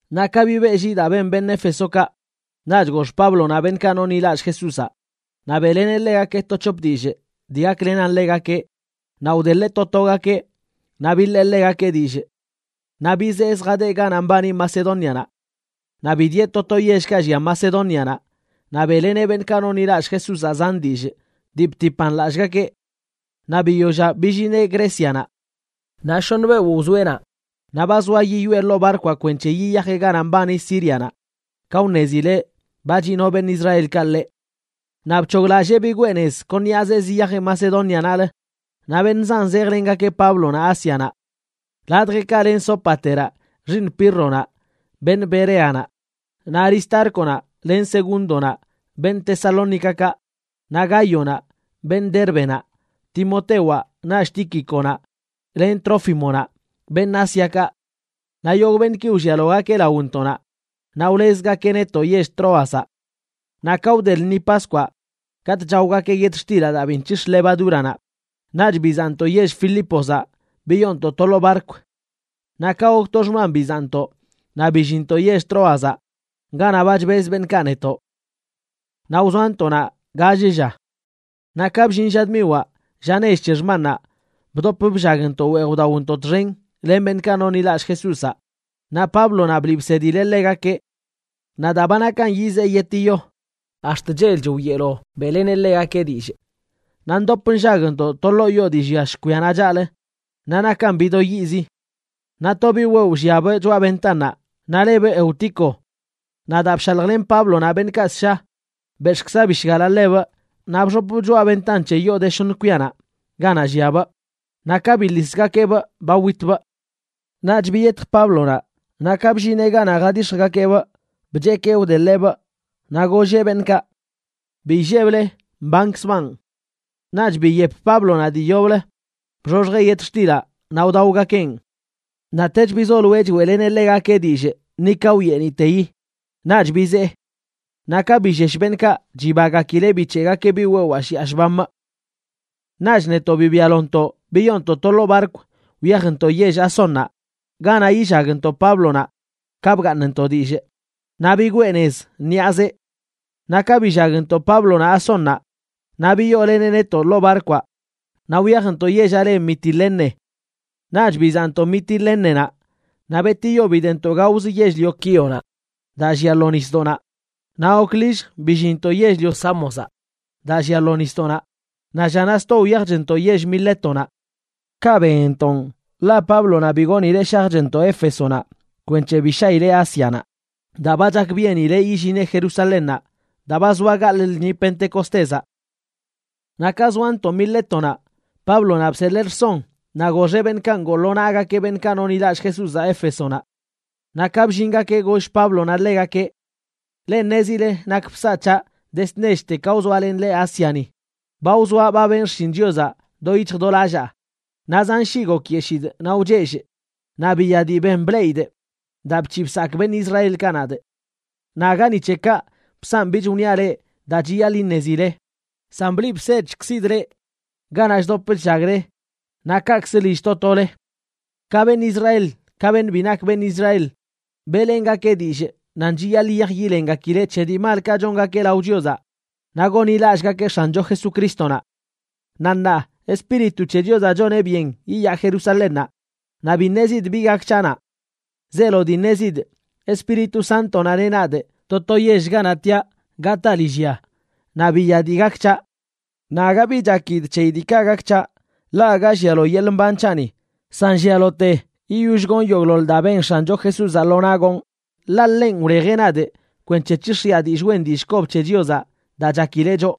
Naꞌ ka bibeꞌlli daa ben beṉꞌ Éfesokaꞌ, naꞌch gox Páblonaꞌ beṉꞌkaꞌ nonḻilallꞌ Jesúzaꞌ naꞌ beꞌleneꞌ ḻegakeꞌ to c̱hop dillꞌ dii gaklenan ḻegakeꞌ naꞌ wdeḻeꞌ to togakeꞌ, naꞌ biḻee ḻegakeꞌ dillꞌ. Naꞌ bizee zjadeꞌ ganaꞌ mbani Macedónianaꞌ. Naꞌ bidieꞌ to to yellkaꞌ llia Macedónianaꞌ naꞌ beꞌleneꞌ beṉꞌkaꞌ nonḻilallꞌ Jesúzaꞌ zan dillꞌ dii btipan lallꞌgakeꞌ. Naꞌ biyollaꞌ billineꞌ Grécianaꞌ, naꞌ shoṉ beoꞌ wzoeꞌ naꞌ. Naꞌ ba zoa yiyoꞌe ḻoo barkwaꞌ kwenc̱he yiyajeꞌ ganaꞌ mbani Sírianaꞌ, ka wṉezileꞌ ba chino beṉꞌ Israelkaꞌ ḻeꞌ. Naꞌ bc̱hoglallee bigwee nez kon ṉiꞌaze ziyajeꞌ Macedónianaꞌlə. Naꞌ beṉꞌ zan zejlengakeꞌ Páblonaꞌ Ásianaꞌ. Ladjeꞌkaꞌ len Sópateraꞌ xiiṉ Pírronaꞌ, beṉꞌ Bereanaꞌ; naꞌ Aristárconaꞌ len Segúndonaꞌ, beṉꞌ Tesalónicakaꞌ; naꞌ Gáyonaꞌ, beṉꞌ Dérbenaꞌ; Timotewaꞌ, naꞌch Tíquiconaꞌ len Trófimonaꞌ, beṉꞌ Ásiakaꞌ. Naꞌ yogꞌ beṉꞌki wllialogakeꞌ laontoꞌnaꞌ, naꞌ wlezgakeꞌ netoꞌ yell Tróazaꞌ. Naꞌ ka wde lṉi Paskwaꞌ katꞌ chaogakeꞌ yetxtilaꞌ daa bi nc̱hix̱ levadúranaꞌ, naꞌch bizaꞌntoꞌ yell Filípozaꞌ biyoontoꞌ to ḻoo barkw. Naꞌ ka gok to xman bizaꞌntoꞌ naꞌ billinntoꞌ yell Tróazaꞌ ganaꞌ ba chbez beṉꞌkaꞌ netoꞌ. Naꞌ wzoantoꞌ naꞌ gall lla. Naꞌ ka bllin lla dmiwaꞌ, lla nech c̱he xmannaꞌ, bdop bllagntoꞌ weej wdaontoꞌ txen len beṉꞌkaꞌ nonḻilallꞌ Jesúzaꞌ, naꞌ Páblonaꞌ bliꞌ bsedileꞌ ḻegakeꞌ. Naꞌ daa ba nakan yizee yetiyo, ax̱t chelch wyeelo beꞌleneꞌ ḻegakeꞌ dillꞌ. Naꞌ ndop nllagntoꞌ to ḻoo yoo dii llia shkwia chaꞌlə, naꞌ nakan bido yiꞌzi. Naꞌ to biꞌ wewꞌ lliabꞌ choꞌa ventannaꞌ, naꞌ lebꞌ Eutico. Naꞌ daa bshaljlen Páblonaꞌ beṉꞌkaꞌ ssha, bex̱ꞌkza bishgalaꞌ ḻebꞌ naꞌ bxopbꞌ choꞌa ventan c̱he yoo de shoṉ kwianaꞌ ganaꞌ lliabꞌ, naꞌ ka biḻisgakeꞌbꞌ ba witbꞌ. Naꞌch biyetj Páblonaꞌ, naꞌ ka bllineꞌ ganaꞌ jadix̱jgakeꞌbꞌ bchekee wdeḻeꞌbꞌ. Naꞌ golleꞌ beṉꞌkaꞌ: ―Bi illeble; mbankzbaꞌn. Naꞌch biyep Páblonaꞌ dii yoblə, bxoxjeꞌ yetxtilaꞌ naꞌ wdaogakeꞌn. Naꞌtech bizoloeꞌ choeꞌleneꞌ ḻegakeꞌ dillꞌ ni ka wyeeniꞌteyi. Naꞌch bizee. Naꞌ ka billesh beṉꞌkaꞌ, chibagakileꞌ bic̱heꞌgakeꞌ biꞌ wewaa shiꞌa shbamꞌ. Naꞌch netoꞌ bibialontoꞌ biyoontoꞌ to ḻoo barkw wyajntoꞌ yell Asónnaꞌ ganaꞌ yillagntoꞌ Páblonaꞌ ka bgaaṉntoꞌ dillꞌ, naꞌ bigwee nez ṉiꞌazeꞌ. Naꞌ ka billagntoꞌ Páblonaꞌ Asónnaꞌ, naꞌ biyooleneꞌ netoꞌ ḻoo barkwaꞌ naꞌ wyajntoꞌ yellaꞌ le Mitilene. Naꞌch bizaꞌntoꞌ Mitilénenaꞌ, naꞌ betiyo bidentoꞌ gaozə yell-lio Quíonaꞌ daa llia lo nisdoꞌnaꞌ. Naꞌ gok lillj billinntoꞌ yell-lio Sámozaꞌ daa llia lo nisdoꞌnaꞌ, naꞌ llanaꞌ sto wyajchntoꞌ yell Milétonaꞌ. Kaꞌ benntoꞌ, ḻaꞌ Páblonaꞌ bi goonileꞌ shajchntoꞌ Éfesonaꞌ kwenc̱he bi shaꞌileꞌ Ásianaꞌ, daa ba chakbyenileꞌ yillineꞌ Jerusalénnaꞌ daa ba zoa gaḻꞌ lṉi Pentecostézaꞌ. Naꞌ ka zoantoꞌ Milétonaꞌ, Páblonaꞌ bseḻee rson naꞌ goxeꞌ beṉꞌkaꞌ ngoo lo naꞌgakeꞌ beṉꞌkaꞌ nonḻilallꞌ Jesúzaꞌ Éfesonaꞌ. Naꞌ ka bllingakeꞌ, goll Páblonaꞌ ḻegakeꞌ: ―Leꞌ ṉezile nak bsaꞌ c̱haꞌ dezd nechte ka wzoalenꞌ leꞌ Ásiani. Ba wzoaꞌ ba benꞌ xshin Chiozaꞌ do yic̱hj do lallaa, naꞌ zan shii gokyeshidꞌ naꞌ wchellꞌ, naꞌ biya dii ben bleꞌidꞌ daa bc̱hiꞌ bsakꞌ beṉꞌ Israelkaꞌ nadꞌ. Naꞌ aga ni c̱he kaꞌ bsanꞌ bich wniaꞌ leꞌ daa chiyaḻꞌ iṉezile, san bliꞌ bsedchkzidꞌ leꞌ ganaꞌ chdop chllagle naꞌ kaꞌkzə lill to tole. Ka beṉꞌ Israel ka beṉꞌ bi nak beṉꞌ Israel, beꞌlengakee dillꞌ nan chiyaḻꞌ yiyaj yilengakileꞌ c̱he dii malkaꞌ chongakeꞌ lao Chiozaꞌ naꞌ gonḻilallꞌgakeꞌ X̱ancho Jesucrístonaꞌ. Naꞌ ṉaa, Espíritu c̱he Chiozaꞌ choneꞌ byen yiyaa Jerusalénnaꞌ, naꞌ bi ṉezidꞌ bi gak c̱haꞌ naꞌ. Zeelo dii ṉezidꞌ, Espíritu Sántonaꞌ neꞌ nadꞌ to to yell ganaꞌ tiaꞌ gataa lillya naꞌ biya dii gak c̱haꞌ. Naꞌ aga bi chakidꞌ c̱heyi diikaꞌ gak c̱haꞌ, ḻaꞌ aga llialo yeḻꞌ mban c̱haꞌni, san llialote yiyoll gonꞌ yogꞌḻoḻ daa ben X̱ancho Jesúzaꞌ lo naꞌ gonꞌ, ḻaꞌ ḻenꞌ wlejeꞌ nadꞌ kwenc̱he c̱hix̱jiꞌa dillꞌ wen dillꞌ kob c̱he Chiozaꞌ daa chakileꞌ choꞌ.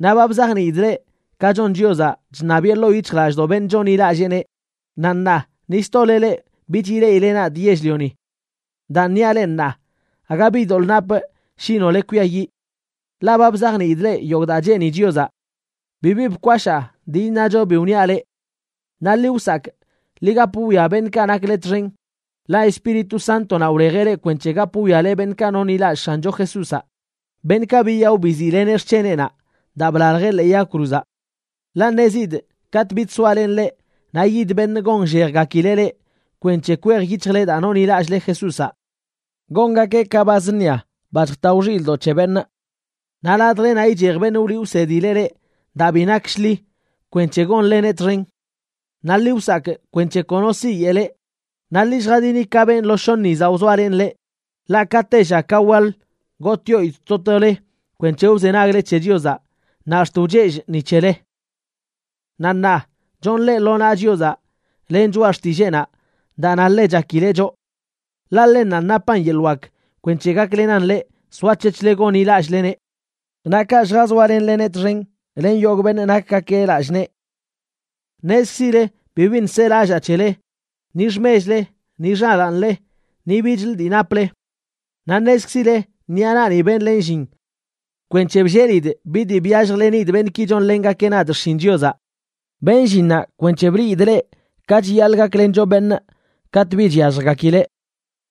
’Naꞌ ba bzajniidꞌ leꞌ ka chon Chiozaꞌ chṉabiꞌe ḻoo yic̱hjlallꞌdoꞌ beṉꞌ chonḻilalleeneꞌ, naꞌ ṉaa ni stole leꞌ bich ileꞌile nadꞌ yell-lioni. Daan niaꞌ leꞌ ṉaa, aga bi doḻꞌ napꞌ shi nole kwiayiꞌ. Ḻaꞌ ba bzajniidꞌ leꞌ yogꞌ daa cheeni Chiozaꞌ. Bibi bkwashaa dii iṉacho bi wniaꞌ leꞌ. Naꞌ ḻi wsakꞌ, ḻi gap wwia beṉꞌkaꞌ nakle txen, ḻaꞌ Espíritu Sántonaꞌ wlejeꞌ leꞌ kwenc̱he gap wwiale beṉꞌkaꞌ nonḻilallꞌ X̱ancho Jesúzaꞌ, beṉꞌkaꞌ biyaꞌo biziꞌleneꞌ xc̱heneꞌnaꞌ daa blaljeꞌ ḻee yag cruzaꞌ. Ḻaꞌ ṉezidꞌ katꞌ bich soalenꞌ leꞌ naꞌ yid beṉꞌ gonllejgakileꞌ leꞌ kwenc̱he kwej yic̱hjle daa nonḻilallꞌle Jesúzaꞌ. Gongakeꞌ ka ba zṉia, ba chjatao xilꞌdoꞌ c̱he beṉꞌ. Naꞌ ladjlenaꞌ ichej beṉꞌ wliꞌ wsedileꞌ leꞌ daa bi nak shḻi kwenc̱he gonleneꞌ txen. Naꞌ ḻi wsakꞌ kwenc̱he kono siyeꞌ leꞌ. Naꞌ ḻi lljadini ka benꞌ lo shoṉ yizaꞌ wzoalenꞌ leꞌ, ḻaꞌ ka tella ka waḻ gotꞌyoidꞌ to tole kwenc̱he wzenagle c̱he Chiozaꞌ, naꞌ ax̱t wchellꞌ ni c̱hele. ’Naꞌ ṉaa, chonꞌ leꞌ lo naꞌ Chiozaꞌ len choꞌa xtilleenaꞌ daa na ḻe chakileꞌ choꞌ. Ḻaꞌ ḻennanꞌ napan yeḻꞌ wak kwenc̱he gaklenan leꞌ soac̱hec̱hle gonḻilallꞌleneꞌ. Naꞌ kaꞌ lljazoalenleneꞌ txen len yogꞌ beṉꞌ nakgakeꞌ lallꞌ nee. Ṉezkzile bibiṉꞌ selallaa c̱hele, ni xmechle, ni xalaanle, ni bichlə dii naple. Naꞌ ṉezkzile ṉiꞌa naꞌni benlenꞌ llin kwenc̱he bllelidꞌ bi dii byalljlenidꞌ beṉꞌki chonlengakeꞌ nadꞌ xshin Chiozaꞌ. Benꞌ llinnaꞌ kwenc̱he bliidꞌ leꞌ ka chiyaḻꞌ gaklencho beṉꞌ katꞌ bi chyalljgakileꞌ.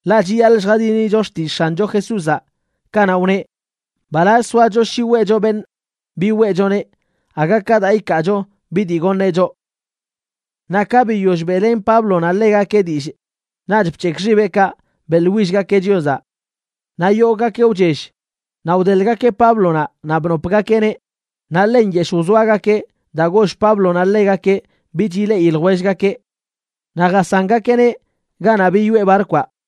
Ḻaꞌ chiyaḻꞌ lljadinicho xtillꞌ X̱ancho Jesúzaꞌ kanaꞌ wneꞌ: “Mbalazch soacho shi weꞌcho beṉꞌ bi weꞌchoneꞌ, aga ka daa ikaacho bi dii goṉeꞌ choꞌ.” Naꞌ ka biyoll beꞌlen Páblonaꞌ ḻegakeꞌ dillꞌ, naꞌch bc̱hekꞌ xibeꞌkaꞌ beꞌḻwillgakeꞌ Chiozaꞌ. Naꞌ yogꞌgakeꞌ wchell, naꞌ wdeḻꞌgakeꞌ Páblonaꞌ naꞌ bnopgakeꞌneꞌ. Naꞌ ḻe nyeshꞌ wzoagakeꞌ daa goll Páblonaꞌ ḻegakeꞌ bich ileꞌi ljwellgakeꞌ. Naꞌ jasangakeꞌneꞌ ganaꞌ biyoꞌe barkwaꞌ.